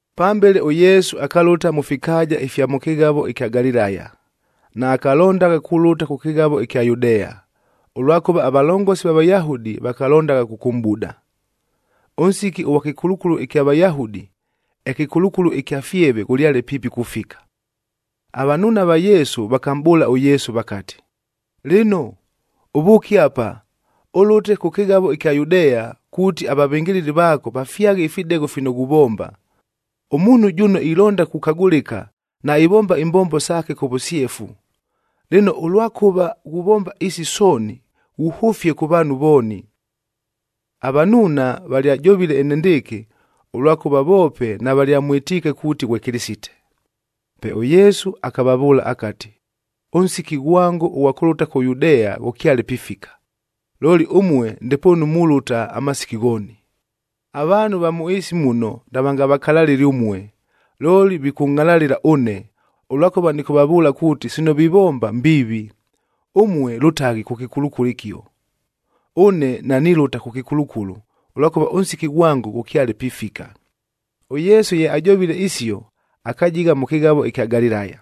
Pambele ʉYesu akalʉta mʉ fikaaja ifya mʉ kɨghavo ɨkya Galilaya. Naakalondagha kulʉta kʉ kɨghavo ɨkya Yudea, ʉlwakʉva avalongosi va Vayahudi vakalondagha kʉkʉmʼbuda. Ʉnsiki ʉghwa kɨkulukulu ɨkya Vayahudi, ɨkɨkulukulu ɨkya fyevea ghʉlyale piipi kufika. Avanuuna va Yesu vakamʼbʉʉla ʉYesu vakati, “Lɨno, ʉvʉʉke apa, ʉlʉte kʉ kɨghavo ɨkya Yudea kuuti avavɨngɨlɨli vaako vafyaghe ifidegho fino ghuvomba. Ʉmuunhu jʉno ilonda kukagʉlɨka, naivomba imbombo saake kʉ vʉsyefu. Lɨno, ʉlwakʉva ghuvomba isi sooni, ghuhʉfie kʉ vaanhu vooni.” Avanuuna valyajovile enendɨɨkɨ, ʉlwakʉva voope navalyamwɨtiike kuuti ghwe Kɨlɨsite. Pe ʉYesu akavavʉʉla akati, “Ʉnsiki ghwango ʉghwa kʉlʉta kʉ Yudea ghʉkyale pifika, looli ʉmue ndepoonu mulʉta amasiki ghooni. Avaanhu va mʉ ɨɨsi muno navangavakalalɨle ʉmue, looli vikʉngʼhalalɨla ʉne, ʉlwakʉva nɨkʉvavʉʉla kuuti, sino vivomba mbiivi. Ʉmue lʉtaghi kʉ kɨkulukulu ɨkio. Ʉne nanilʉta kʉ kɨkulukulu, ʉlwakʉva ʉnsiki ghwango ghʉkyale pifika.” ɄYesu ye ajovile isio, akajigha mʉ kɨghavo ɨkya Galilaya.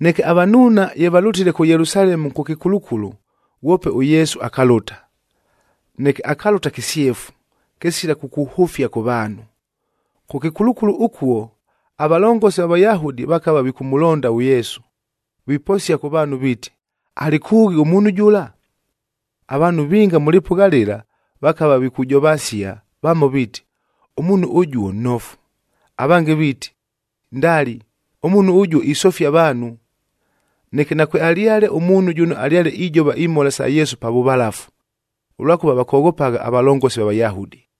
Neke avanuuna ye valʉtile kʉ Yelusalemu kʉ kɨkulukulu, ghwope ʉYesu akalʉta, neke akalʉta kɨsyefu, kɨsila kukuhʉfia kʉ vaanhu. Kʉ kɨkulukulu ʉkuo, avalongosi va Vayahudi vakava vikʉmʉlonda ʉYesu, viposia kʉ vaanhu viiti, “Alɨ kʉʉghi ʉmuunhu jʉla?” Avaanhu vinga mʉ lɨpʉgha lɨla, vakava vikujovasia, vamo viiti, “Ʉmuunhu ʉjuo nnofu,” avange viiti, “Ndali! Ʉmuunhu ʉjuo isofia avaanhu.” Neke nakwealyale ʉmuunhu jʉno alyale ijova imhola sa Yesu pa vʉvalafu, ʉlwakʉva vakoghopagha avalongosi va Vayahudi.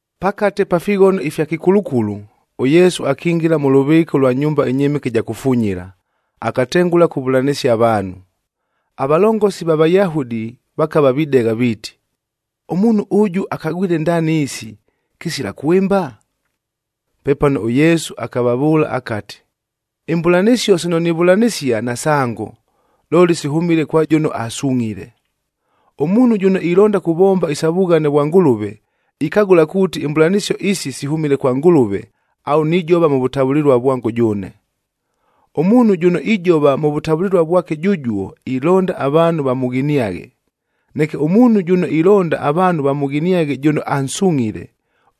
Pakate pa fighono ifya kɨkulukulu, ʉYesu akingila mʉ lʉvɨɨka ʉlwa nyumba ɨnyɨmɨke ɨja kufunyila, akatengʉla kuvʉlanɨsia avaanhu. Avalongosi va Vayahudi vakava videgha, viiti, “Ʉmuunhu ʉjʉ akagwile ndaani isi, kɨsila kwɨmba?” Pepano ʉYesu akavavʉʉla akati, “Imbʉlanɨsio sino nivʉlanɨsia nasango, looli sihʉmile kwa jʉno asungʼhile. Ʉmuunhu jʉno ilonda kuvomba isa vughane vwa Ngʉlʉve, ikagʉla kuuti imbʉlanɨsio isi sihʉmile kwa Ngʉlʉve au nijova mʉ vʉtavʉlɨlua vwango jʉʉne. Ʉmuunhu jʉno ijova mʉ vʉtavʉlɨlua vwake jʉjuo, ilonda avaanhu vamʉghiniaghe. Neke ʉmuunhu jʉno ilonda avaanhu vamʉghiniaghe jʉno ansungʼhile,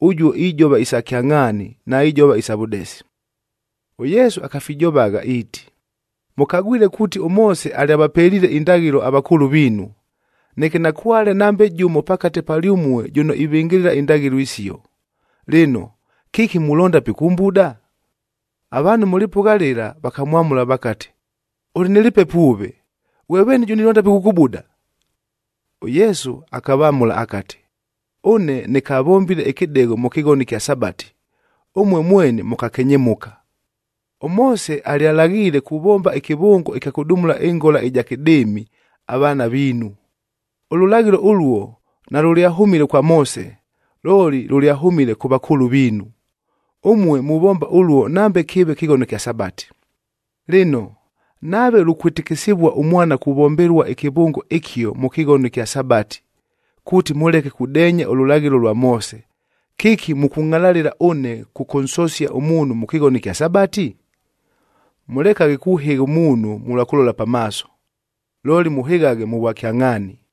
ʉjuo ijova isa kyangʼhaani, naijova isa vʉdesi.” ɄYesu akafijovagha iiti, “Mʉkagwile kuuti ʉMoose alyavapeliile indaghɨlo avakʉʉlʉ viinu. Neke nakwale nambe jʉmo pakate palyʉmue jʉno ivɨngɨlɨla indaghɨlo isio. Lɨno, kɨki mulonda pikʉmbuda?” Avaanhu mʉ lɨpʉgha lɨla vakamwamʉla vakati, “Ʉlɨ nɨ lɨpepo ʉve! Ghwe veeni jʉno ilonda pikʉkʉbuda?” ɄYesu akavamʉla akati, “Ʉne nɨkavombile ɨkɨdegho mʉ kɨghono ɨkya Sabati,b ʉmue mweni mʉkakenyemʉka. ɄMoose alyalaghiile kuvomba ɨkɨvʉngo ɨkya kʉdumula ɨngola ɨja kɨdɨɨmic avaana viinu. Ʉlʉlaghɨlo ʉluo nalʉlyahʉmile kwa Moose, looli lʉlyahʉmile kʉ vakʉʉlʉ viinu. Ʉmue muvomba ʉluo nambe kɨɨve kɨghono kya Sabati. Lɨno, nave lukwɨtɨkɨsɨvua ʉmwana kuvombelua ɨkɨvʉngo ɨkio mʉ kɨghono ɨkya Sabati, kuuti mʉleke kudeenya ʉlʉlaghɨlo lwa Moose, kɨki mʉkʉngʼhalalɨla ʉne kʉkʉnsosia ʉmuunhu mʉ kɨghono ɨkya Sabati? Mʉlekaghe kuhɨgha ʉmuunhu mʉlwa kʉlola pamaaso, looli mʉhɨghaghe mʉ vwakyangʼhaani.”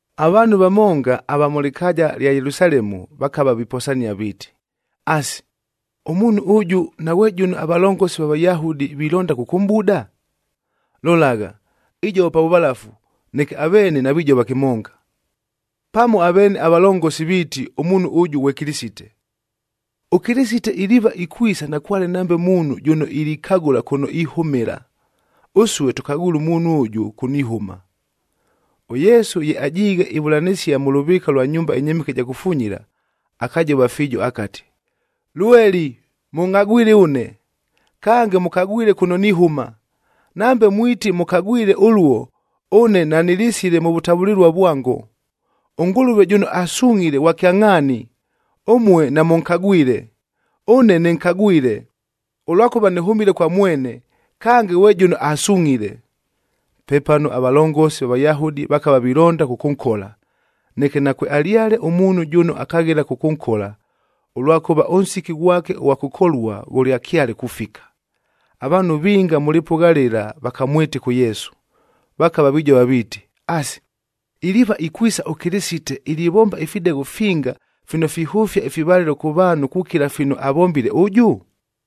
Avaanhu vamonga ava mʉ lɨkaaja lya Yelusalemu vakava viposania viiti, “Asi, ʉmuunhu ʉjʉ naghwe jʉno avalongosi va Vayahudi vilonda kʉkʉmʼbuda? Lolagha, ijova pa vʉvalafu, neke aveene navijova kɨmonga! Pamo aveene avalongosi viiti ʉmuunhu ʉjʉ ghwe Kɨlɨsite! ɄKɨlɨsite iliiva ikwisa nakwale nambe muunhu jʉno ilikagʉla kʉno ihʉmɨla! Ʉsue tʉkagwile ʉmuunhu ʉjʉ kʉno ihʉma!” ɄYesu ye ajiighe ivʉlanɨsia mʉ lʉvɨɨka ʉlwa nyumba ɨnyɨmɨke ɨja kufunyila, akajova fiijo akati, “Lweli mʉngʼhagwile ʉne, kange mʉkagwile kʉno nihʉma. Nambe mwiti mʉkagwile ʉluo, ʉne nanɨlisile mʉ vʉtavʉlɨlua vwango. ɄNgʉlʉve jʉno asungʼhile ghwa kyangʼhaani, ʉmue namʉnkagwile. Ʉne nɨnkagwile, ʉlwakʉva nɨhʉmile kwa mwene, kange ghwe jʉno asungʼhile.” Pepano avalongosi va Vayahudi vakava vilonda kʉkʉnkola, neke nakwealyale ʉmuunhu jʉno akaghela kʉkʉnkola, ʉlwakʉva ʉnsiki ghwake ʉghwa kʉkolua ghʉlyakyale kufika. Avaanhu vinga mʉ lɨpʉgha lɨla vakamwɨtɨka ʉYesu, vakava vijova viiti, “Asi, iliiva ikwisa ʉKɨlɨsite ilivomba ifidegho finga fino fihʉfia ifivalɨlo kʉ vaanhu kukila fino avombile ʉjʉ?”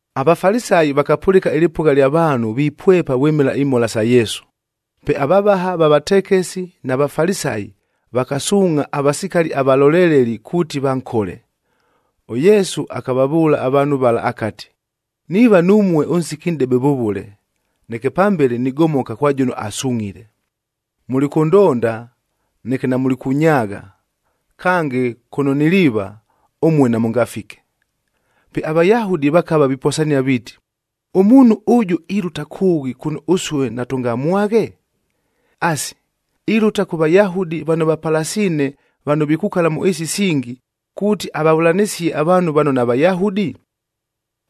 AVafalisayi vakapʉlɨka ɨlɨpʉgha lya vaanhu vipwepa vwɨmɨla imhola sa Yesu, pe avavaha va vatekesi na Vafalisayi vakasuungʼha avasikali avalolelelid kuuti vankole. ɄYesu akavavʉʉla avaanhu vala akati, “Niiva numue ʉnsiki nʼdebe vʉvʉle, neke pambele nigomoka kwa jʉno asungʼhile. Mulikʉndonda, neke namulikʉnyaagha; kange kʉno niliiva, ʉmue namʉngafike.” Pe aVayahudi vakava viposania viiti, “Ʉmuunhu ʉjʉ ilʉta kʉʉghi kʉno ʉsue natʉngamwaghe? Asi, ilʉta kʉ Vayahudi vano vapalasiine vano vikukala mʉ ɨɨsi isingi, kuuti avavʉlanɨsie avaanhu vano naVayahudi?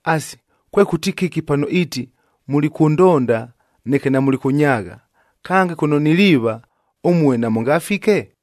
Asi, kwekʉti kɨki pano iiti, ‘Mulikʉndonda, neke namulikʉnyaagha, kange kʉno niliiva, ʉmue namʉngafike’?”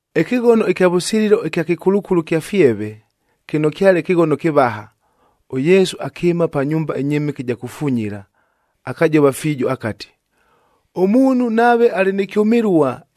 Ɨkɨghono ɨkya vʉsililo ɨkya kɨkulukulu kya fyeve, kɨno kyale kɨghono kɨvaha, ʉYesu akɨɨma pa nyumba ɨnyɨmɨke ɨja kufunyila, akajova fiijo akati, “Ʉmuunhu nave alɨ nɨ kyʉmɨlua,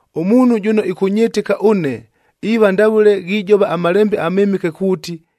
Ʉmuunhu jʉno ɨkʉnyɨtɨka ʉne, iiva ndavʉle ghijova aMalembe aMɨmɨke kuuti,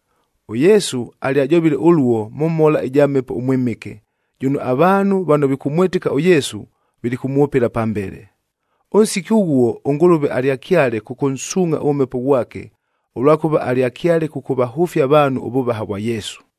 ɄYesu alyajovile ʉluo mʉ mhola ɨja Mhepo ʉMwɨmɨke, jʉno avaanhu vano vikʉmwɨtɨka ʉYesu, vilikʉmwʉpɨla pambele. Ʉnsiki ʉghuo, ʉNgʉlʉve alyakyale kʉkʉnsuungʼha ʉMhepo ghwake, ʉlwakʉva alyakyale kʉkʉvahʉfia avaanhu ʉvʉvaha vwa Yesu.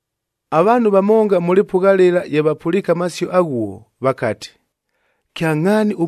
Avaanhu vamonga mʉ lɨpʉgha lɨla ye vapʉliike amasio aghuo, vakati, “Kyangʼhaani,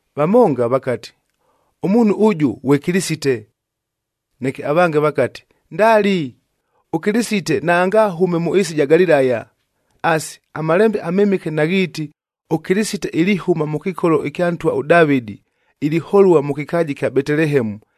Vamonga vakati, “Ʉmuunhu ʉjʉ ghwe Kɨlɨsite.” Neke avange vakati, “Ndali, ʉKɨlɨsite naangahʉme mʉ ɨɨsi ɨja Galilaya. Asi, aMalembe aMɨmɨke naghiiti, ‘ɄKɨlɨsite ilihʉma mʉ kɨkolo ɨkya ntwa ʉDavɨdi,h iliholua mʉ kɨkaaja ɨkya Betelehemu,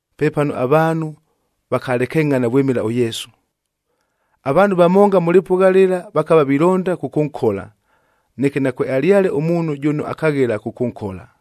Pepano avaanhu vakalekengʼhana vwɨmɨla ʉYesu. Avaanhu vamonga mʉ lɨpʉgha lɨla vakava vilonda kʉkʉnkola, neke nakwealyale ʉmuunhu jʉno akaghela kʉkʉnkola.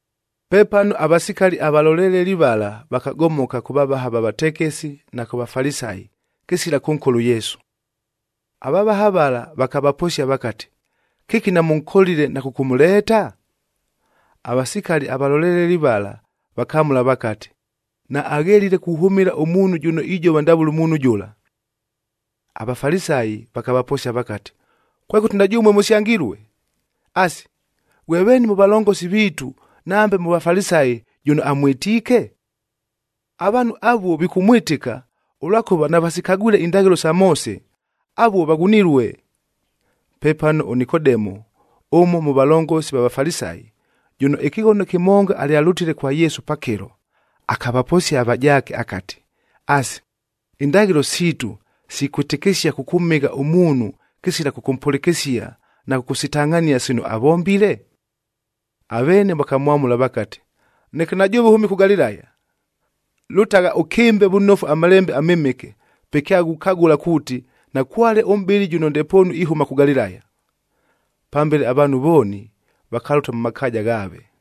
Pepano avasikali avaloleleli vala vakagomoka kʉ vavaha va vatekesi na kʉ Vafalisayi, kɨsila kʉnkola ʉYesu. Avavaha vala vakavaposia vakati, “Kɨki namʉnkolile na kʉkʉmʉleeta?” Avasikali avaloleleli vala vakamʉla vakati, “Naaghelile kuhʉmɨla ʉmuunhu jʉno ijova ndavʉle ʉmuunhu jʉla.” AVafalisayi vakavaposia vakati, “Kwekʉti na jʉmue mʉsyangilue? Asi, ghwe veeni mʉ valongosi viitu, nambe mʉ Vafalisayi jʉno amwɨtiike? Avaanhu avuo vikʉmwɨtɨka, ʉlwakʉva navasikagwile indaghɨlo sa Moose, avuo vaghunilue!” Pepano ʉNikodemu, ʉmo mʉ valongosi va Vafalisayi, jʉno ɨkɨghono kɨmonga alyalʉtile kwa Yesu pakɨlo,j akavaposia avajaake akati, “Asi, indaghɨlo siitu sikwɨtɨkɨsia kʉkʉmhɨgha ʉmuunhu kɨsila kʉmpʉlɨkɨsia na kʉkʉsitangʼhania sino avombile?” Aveene vakamwamʉla vakati, “Neke na jʉʉve ʉhʉmile kʉ Galilaya! Lʉtagha ʉkɨmbe vʉnofu aMalembe aMɨmɨke, pe kyaghukagʉla kuuti, nakwale ʉmʼbɨli jʉno ndepoonu ihʉma kʉ Galilaya!” Pambele avaanhu vooni vakalʉta mʉ makaaja ghaave.k